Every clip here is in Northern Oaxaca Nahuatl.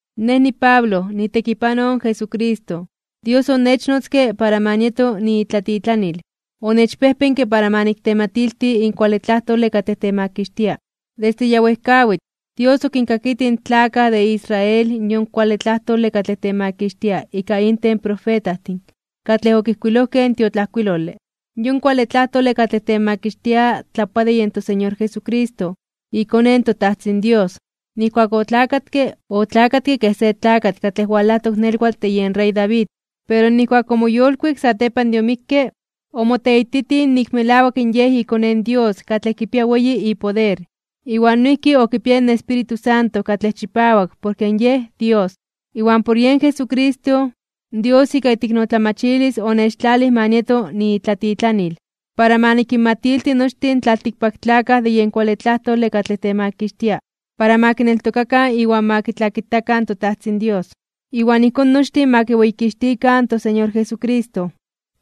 Nej niPablo, niitekipanoj in Jesucristo. Dios onechnotzke para ma nieto niitlatitlanil. Onechpejpenke para ma niktematilti in kuale tlajtole katlej temakixtia. Desde ya wejkawitl, Dios okinkakitij in tlakaj de Israel yon kuale tlajtole katlej temakixtia ika inten in profetajtin katlej okijkuilojkej in tiotlajkuilole. Yon kuale tlajtole katlej temakixtia tlapoa de yen toSeñor Jesucristo, iKone in toTajtzin Dios. Nijkuak otlakatke, otlakatke kej se tlakatl katlej walajtok nelwatl de yen rey David. Pero nijkuak omoyolkuik satepan de omikke, omoteititij nik melawak Yej iKone in Dios katlej kipia weyi ipoder, iwan noijki okipiaya in Espíritu Santo katlej chipawak porke Yej Dios. Iwan por yen Jesucristo, Dios ika iteiknotlamachilis onechtlalij ma nieto niitlatitlanil, para ma nikinmatilti nochtin in tlaltikpaktlakaj de yen kuale tlajtole katlej temakixtia, para ma kineltokakan iwan ma kitlakitakan toTajtzin Dios, iwan ijkón nochtin ma kiweyikixtikan toSeñor Jesucristo.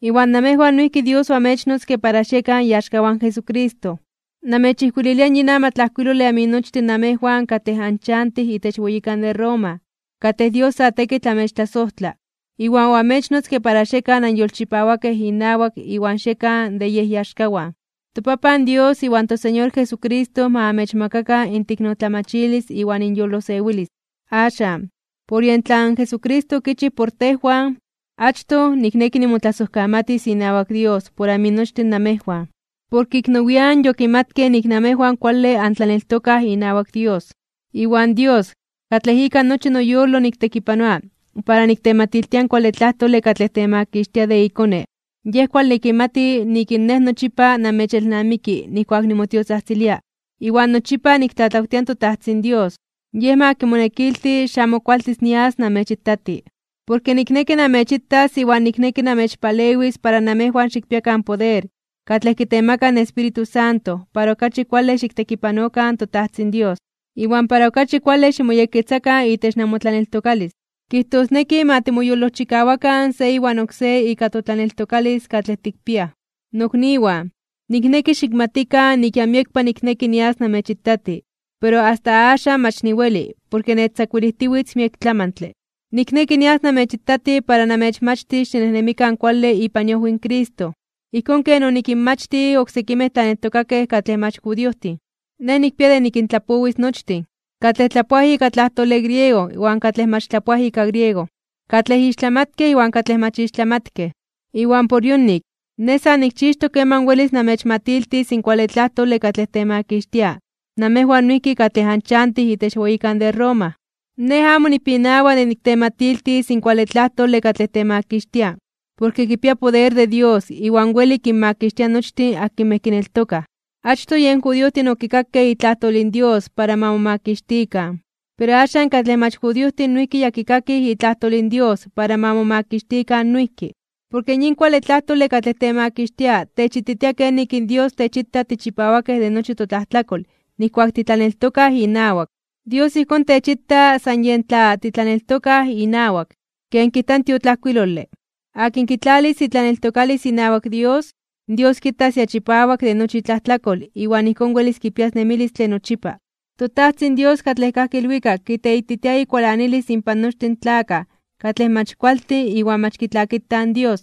Iwan namejwan noijki Dios oamechnotzke para xiekan iaxkawan in Jesucristo. Namechijkuililia yin amatlajkuilole aminochtin namejwan katlej anchantij itech weyikan de Roma, katlej Dios sa tekitl amechtlasojtla, iwan oamechnotzke para xiekan anyolchipawakej inawak iwan xiekan de Yej iaxkawan. ToPapan Dios iwan toSeñor Jesucristo ma amechmakakan inteiknotlamachilis iwan inyolosewilis. Axan, por yen tlan Jesucristo okichij por tejwan, achtoj, nikneki nimotlasojkamatis inawak Dios por aminochtin namejwan, porke ik nowian (nian nepa) yokimatkej nik namejwan kuale antlaneltokaj inawak Dios. Iwan Dios, katlej ika nochi noyolo niktekipanoa para niktematiltia in kuale tlajtole katlej temakixtia de iKone, Yej kuale kimati nik nej nochipa namechelnamiki nijkuak nimotiotzajtzilia. Iwan nochipa niktlatlawtia in toTajtzin Dios, Yej ma kimonekilti xamo kualtis nias namechitati. Porke nikneki namechitas iwan nikneki namechpalewis para namejwan xikpiakan poder katlej kitemaka in Espíritu Santo para okachi kuale xiktekipanokan in toTajtzin Dios, iwan para okachi kuale ximoyekketzakan itech namotlaneltokalis. Kijtosneki, ma timoyolojchikawakan se iwan oksé ika totlaneltokalis katlej tikpiaj. Nokniwan, nikneki xikmatikan nik ya miekpa nikneki nias namechitati, pero asta axan mach niweli porke nechtzakuilijtiwitz miek tlamantle. Nikneki nias namechitati para namechmachtis xinejnemikan kuale ipan iojwi in Cristo, ijkón ken onikinmachtij oksekimej tlaneltokakej katlej mach judiojtin. Nej nikpia de nikintlapowis nochtin, katlej tlapoaj ika tlajtole griego iwan katlej mach tlapoaj ika griego, katlej ixtlamatkej iwan katlej mach ixtlamatkej. Iwan por yonik, nej sa nikchixtok keman welis namechmatiltis in kuale tlajtole katlej temakixtia namejwan noijki katlej anchantij itech weyikan de Roma. Nej amo nipinawa de niktematiltis in kuale tlajtole katlej temakixtia, porke kipia poder de Dios iwan weli kinmakixtia nochtin akinmej kineltokaj. Achtoj yen judiojtin okikakej itlajtol in Dios para ma momakixtikan, pero axan katlej mach judiojtin noijki ya kikakij itlajtol in Dios para ma momakixtikan noijki. Porke yin kuale tlajtole katlej temakixtia techititia kenik in Dios techita tichipawakej de nochi totlajtlakol nijkuak titlaneltokaj inawak. Dios ijkón techita san yen tla titlaneltokaj inawak. Ken kijta in tiotlajkuilole: “Akin kitlalis itlaneltokalis inawak Dios, in Dios kitas ya chipawak de nochi itlajtlakol iwan ijkón welis kipias nemilistle nochipa.” ToTajtzin Dios katlej kajki ilwikak kiteititia ikualanilis inpan nochtin in tlakaj katlej mach kualtin iwan mach kitlakitaj in Dios.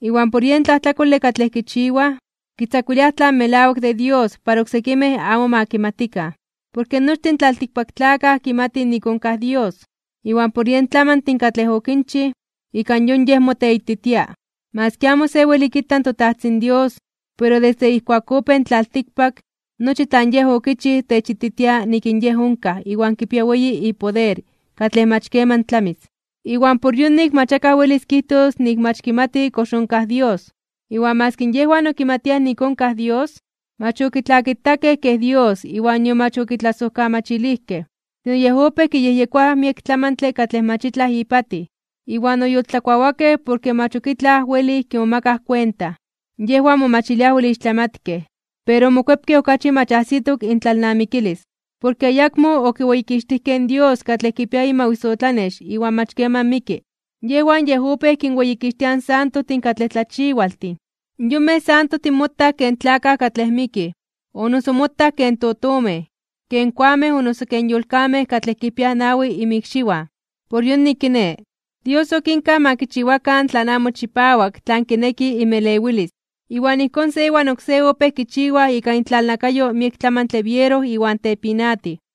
Iwan por yen tlajtlakole katlej kichiwaj, kitzakuiliaj tlan melawak de Dios para oksekimej amo ma kimatikan. Porke nochtin in tlaltikpaktlakaj kimatij nik onkaj Dios, iwan por yen tlamantin katlej okinchij, ika yon Yej moteititia. Maski amo se weli kita in toTajtzin Dios, pero desde ijkuak opéj in tlaltikpak, nochi tlan Yej okichij techititia nik in Yej onkaj iwan kipia weyi ipoder katlej mach keman tlamis. Iwan por yonik mach akaj welis kijtos nik mach kimati kox onkaj Dios. Iwan maski yejwan okimatiaj nik onkaj Dios, mach okitlakitakej kej Dios iwan nion mach okitlasojkamachilijkej. Sino yej opéj kiyejyekoaj miek tlamantle katlej mach itlaj ipatij, iwan oyoltlakuawakej porke mach ok itlaj welij kimomakaj kuenta. Yejwan momachiliaj wel ixtlamatkej, pero omokuepkej okachi mach ajsitok intlalnamikilis. Porke ayakmo okiweyikixtijkej in Dios katlej kipia imawisotlanex iwan mach keman miki. Yejwan yej opéj kinweyikixtiaj in santojtin katlej tlachiwaltin. Yonmej santojtin motaj ken tlakaj katlej mikij, o noso motaj ken totomej, ken koamej o noso ken yolkamej katlej kipiaj nawi inmikxiwan. Por yonik, kiné, Dios okinkaj ma kichiwakan tlan amo chipawak tlan kineki inmelewilis. Iwan ijkón se iwan oksé opéj kichiwaj ika intlalnakayo miek tlamantle biero iwan tepinatij.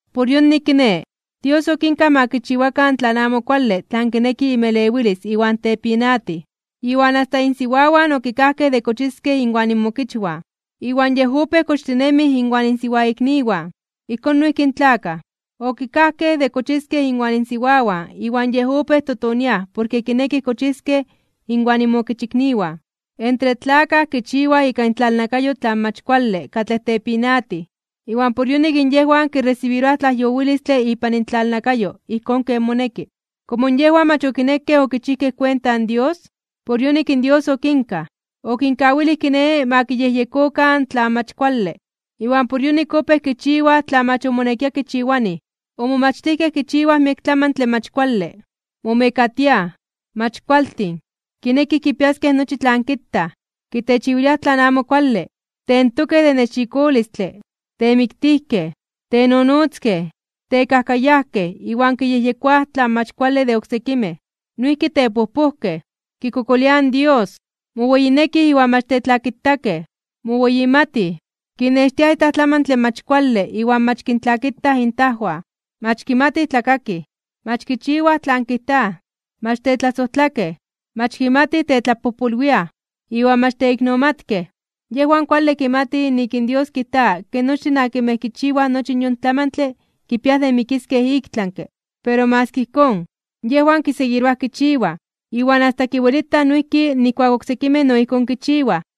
Por yonik, kiné, Dios okinkaj ma kichiwakan tlan amo kuale tlan kineki inmelewilis iwan tepinatij, iwan asta insiwawan okikajkej de kochiskej inwan inmokichwan, iwan yej opéj kochtinemij inwan insiwaikniwan. Ijkón noijki in tlakaj, okikajkej de kochiskej inwan insiwawan iwan yej opéj totoniaj porke kinekij kochiskej inwan inmokichikniwan (intlakaikniwan). Entre tlakaj kichiwaj ika intlalnakayo tlan mach kuale katlej tepinatij, iwan por yonik yejwan kiresibiroaj tlajyowilistle ipan intlalnakayo ijkón ken moneki. Komo yejwan mach okinekej okichijkej kuenta in Dios, por yonik in Dios okinkaj. Okinkawilij kiné ma kiyejyekokan tlan mach kuale, iwan por yonik opéj kichiwaj tlan mach omonekia kichiwanij. Omomachtijkej kichiwaj miek tlamantle mach kuale. Momekatiaj, mach kualtin, kinekij kipiaskej nochi tlan kitaj, kitechiwiliaj tlan amo kuale. Tentokej de nexikolistle, temiktijkej, tenonotzkej, tekajkayajkej iwan kiyejyekoaj tlan mach kuale de oksekimej. Noijki tepojpojkej, kikokoliaj in Dios, moweyinekij iwan mach tetlakitakej. Moweyimatij, kinextiaj itlaj tlamantle mach kuale iwan mach kintlakitaj intajwan. Mach kimatij tlakakij, mach kichiwaj tlan kijtaj, mach tetlasojtlakej, mach kimatij tetlapojpolwiaj, iwan mach teiknomatkej. Yejwan kuale kimatij nik in Dios kijta ke nochtin akinmej kichiwaj nochi yon tlamantle kipia de mikiskej iktlanke (ik tlami). Pero maski ijkón, yejwan kiseguiroaj kichiwaj, iwan asta kiwelitaj noijki nijkuak oksekimej no ijkón kichiwaj.